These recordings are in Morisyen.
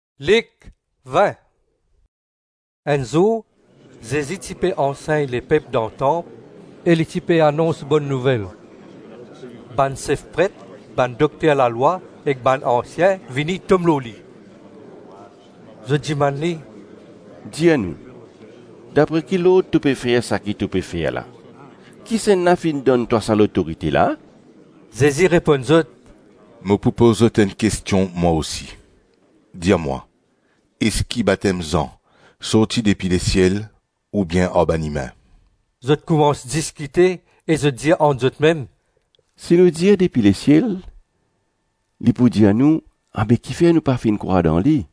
Kot lotorite Zezi sorti? Enn zour, Zezi ti pe ansegn lepep dan tanp e li ti pe anons Bonn Nouvel. Bann sef pret, bann dokter lalwa ek bann ansien vini tom lor li. Zot dimann li, “Dir nou, dapre ki lord to pe fer seki to pe fer la, kisannla finn donn twa sa lotorite la? Zezi reponn zot, “Mo pou poz zot enn kestion mwa osi. Dir mwa, eski batem Zan sorti depi lesiel ou bien ar bann imin?” Zot koumans diskite e zot dir ant zotmem, “Si nou dir depi lesiel, li pou dir nou, abe kifer nou pa finn krwar dan li?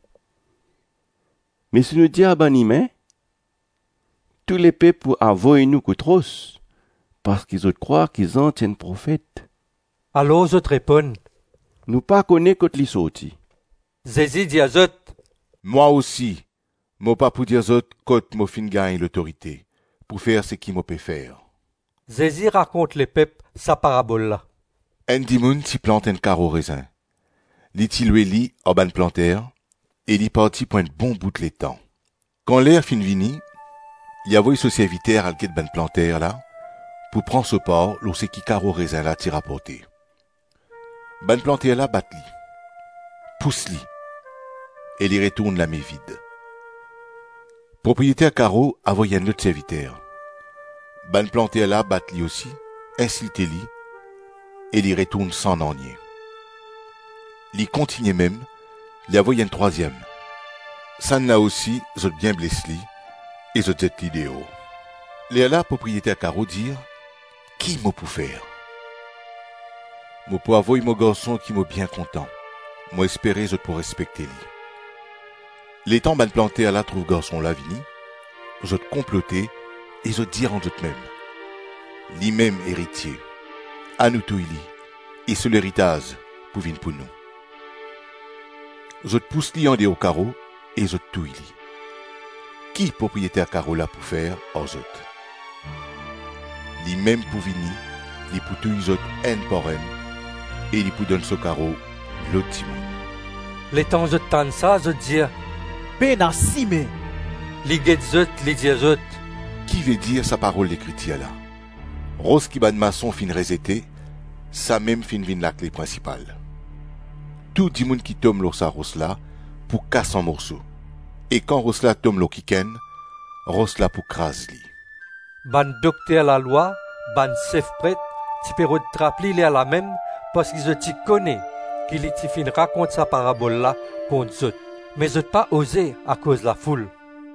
Me si nou dir ar bann imin, tou lepep pou avoy nou kout ros, parski zot krwar ki Zan ti enn profet.” Alor zot reponn, “Nou pa kone kot li sorti.” Zezi dir zot, “Mwa osi mo pa pou dir zot kot mo finn gagn lotorite pou fer seki mo pe fer.” Zezi rakont lepep sa parabol la: “Enn dimoun ti plant enn karo rezin, li ti lwe li ar bann planter e li parti pou enn bon bout letan. Kan ler finn vini, li avoy so serviter al get bann planter la pou pran so par lor seki karo rezin la ti raporte. Bann planter la bat li, pous li e li retourn lame vid. Propriyeter karo avoy enn lot serviter; bann planter la bat li osi, insilte li e li retourn san nanye. Li kontigne mem, li avoy enn trwaziem. Sannla osi zot bien bles li e zot zet li deor. Lerla propriyeter karo dir, ‘Ki mo pou fer? Mo pou avoy mo garson ki mo bien kontan; mo espere zot pou respekte li.’ Letan bann planter la trouv garson la vini, zot konplote e zot dir ant zotmem, ‘Limem eritie; anou touy li e so leritaz pou vinn pou nou.’ Zot pous li andeor karo e zot touy li. Ki propriyeter karo la pou fer ar zot? Limem pou vini, li pou touy zot enn par enn e li pou donn so karo lot dimoun.” Letan zot tann sa, zot dir, “Pena sime!” Li get zot, li dir zot, “Ki vedir sa parol Lekritir la: ‘Ros ki bann mason finn rezete, Samem finn vinn lakle prinsipal’? Tou dimoun ki tom lor sa ros la pou kas an morso e kan ros la tom lor kikenn, ros la pou kraz li.” Bann dokter lalwa, bann sef pret ti pe rod trap li lerlamem parski zot ti kone ki li ti finn rakont sa parabol la kont zot; me zot pa oze akoz lafoul.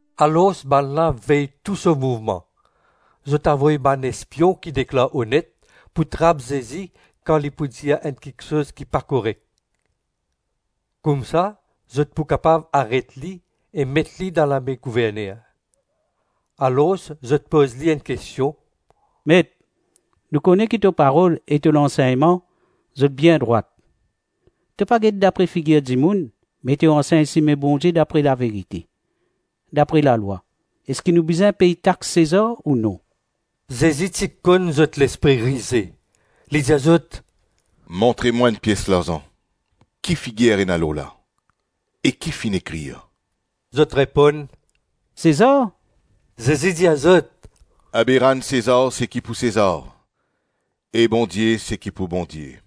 Alors bannla vey tou so mouvman; zot avoy bann espion ki deklar onet, pou trap Zezi kan li pou dir enn kiksoz ki pa korek. Koumsa zot pou kapav aret li e met li dan lame gouverner. Alors zot poz li enn kestion, “Met, nou kone ki to parol e to lansegnman zot bien drwat; to pa get dapre figir dimoun, me to ansegn sime Bondie dapre laverite. Dapre lalwa, eski nou bizin pey tax Sezar ou non?” Zezi ti konn zot lespri rize. Li dir zot, “Montre mwa enn pies larzan. Ki figir ena lor la e ki finn ekrir?” Zot reponn, “Sezar.” Zezi dir zot, “Abe rann Sezar seki pou Sezar, e Bondie seki pou Bondie.”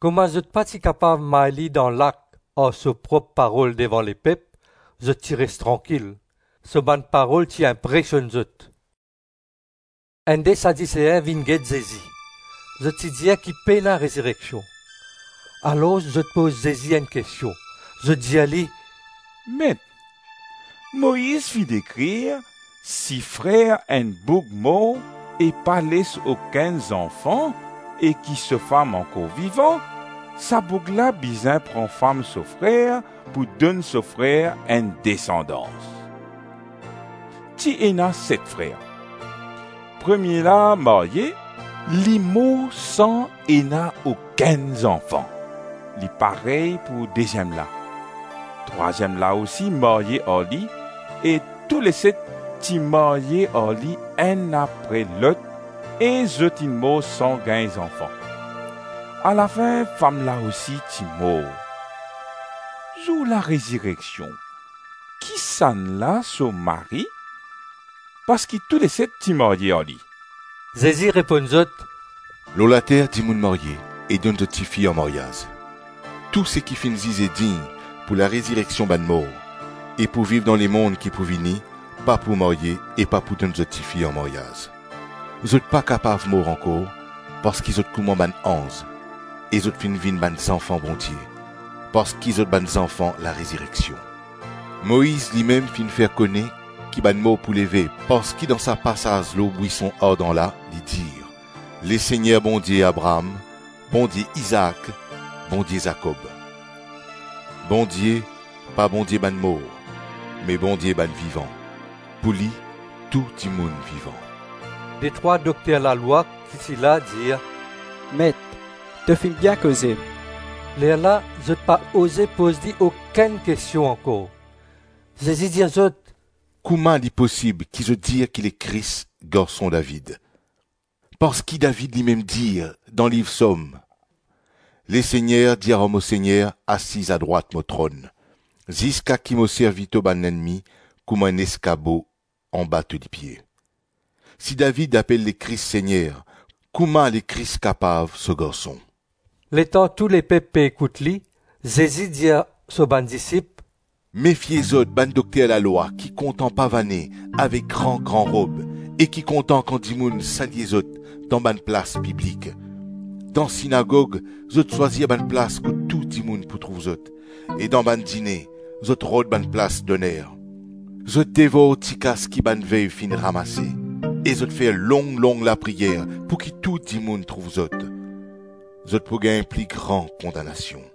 Kouma zot pa ti kapav may li dan lak ar so prop parol devan lepep, zot ti res trankil. So bann parol ti inpresionn zot. Enn de Sadisein vinn get Zezi. (Zot ti dir ki pena rezireksion.) Alors zot poz Zezi enn kestion. Zot dir li, “Met, Moiz finn ekrir, ‘Si frer enn boug mor e pa les okenn zanfan e ki so fam ankor vivan, sa boug la bizin pran fam so frer pou donn so frer enn desandans.’ Ti ena set frer. Premie la marye. Li mor san ena okenn zanfan. Li parey pou deziem la. Trwaziem la osi marye ar li, e touleset ti marye ar li enn apre lot e zot inn mor san gagn zanfan. Alafin fam la osi ti mor. Zour larezireksion, kisannla so mari parski touleset ti marye ar li?” Zezi reponn zot, “Lor later dimoun marye e donn zot tifi an maryaz. Tou seki finn zize dign pou larezireksion bann mor, e pou viv dan lemonn ki pou vini, pa pou marye e pa pou donn zot tifi anmaryaz. Zot pa kapav mor ankor parski zot kouma bann anz e zot finn vinn bann zanfan Bondie parski zot bann zanfan larezireksion. Moiz limem finn fer kone ki bann mor pou leve parski dan sa pasaz lor bwison ardan la, li dir, ‘Lesegner Bondie Abraam, Bondie Izaak, Bondie Zakob’. Bondie, pa Bondie bann mor me Bondie bann vivan. Pou li, tou dimoun vivan.” Detrwa dokter lalwa ki ti la dir, “Met, to finn bien koze.” Lerla zot pa oze poz li okenn kestion ankor. Zezi dir zot, “Kouma li posib ki zot dir ki Lekris Garson David? Parski David limem dir dan Liv Psom, ‘Lesegner dir ar mo Segner, asiz adrwat mo tronn, ziska ki mo servi to bann lennmi kouma enn eskabo anba to lipie.’ Si David apel Lekris Segner, kouma Lekris kapav so garson?” Letan tou lepep pe ekout li, Zezi dir so bann disip, “Mefie zot bann dokter lalwa ki kontan pavane avek gran-gran rob e ki kontan kan dimoun salye zot dan bann plas piblik; dan sinagog, zot swazir bann plas kot tou dimoun pou trouv zot e dan bann dine, zot rod bann plas doner. Zot devor tikas ki bann vev finn ramase e zot fer long-long lapriyer pouki tou dimoun trouv zot. Zot pou gagn pli gran kondanasion.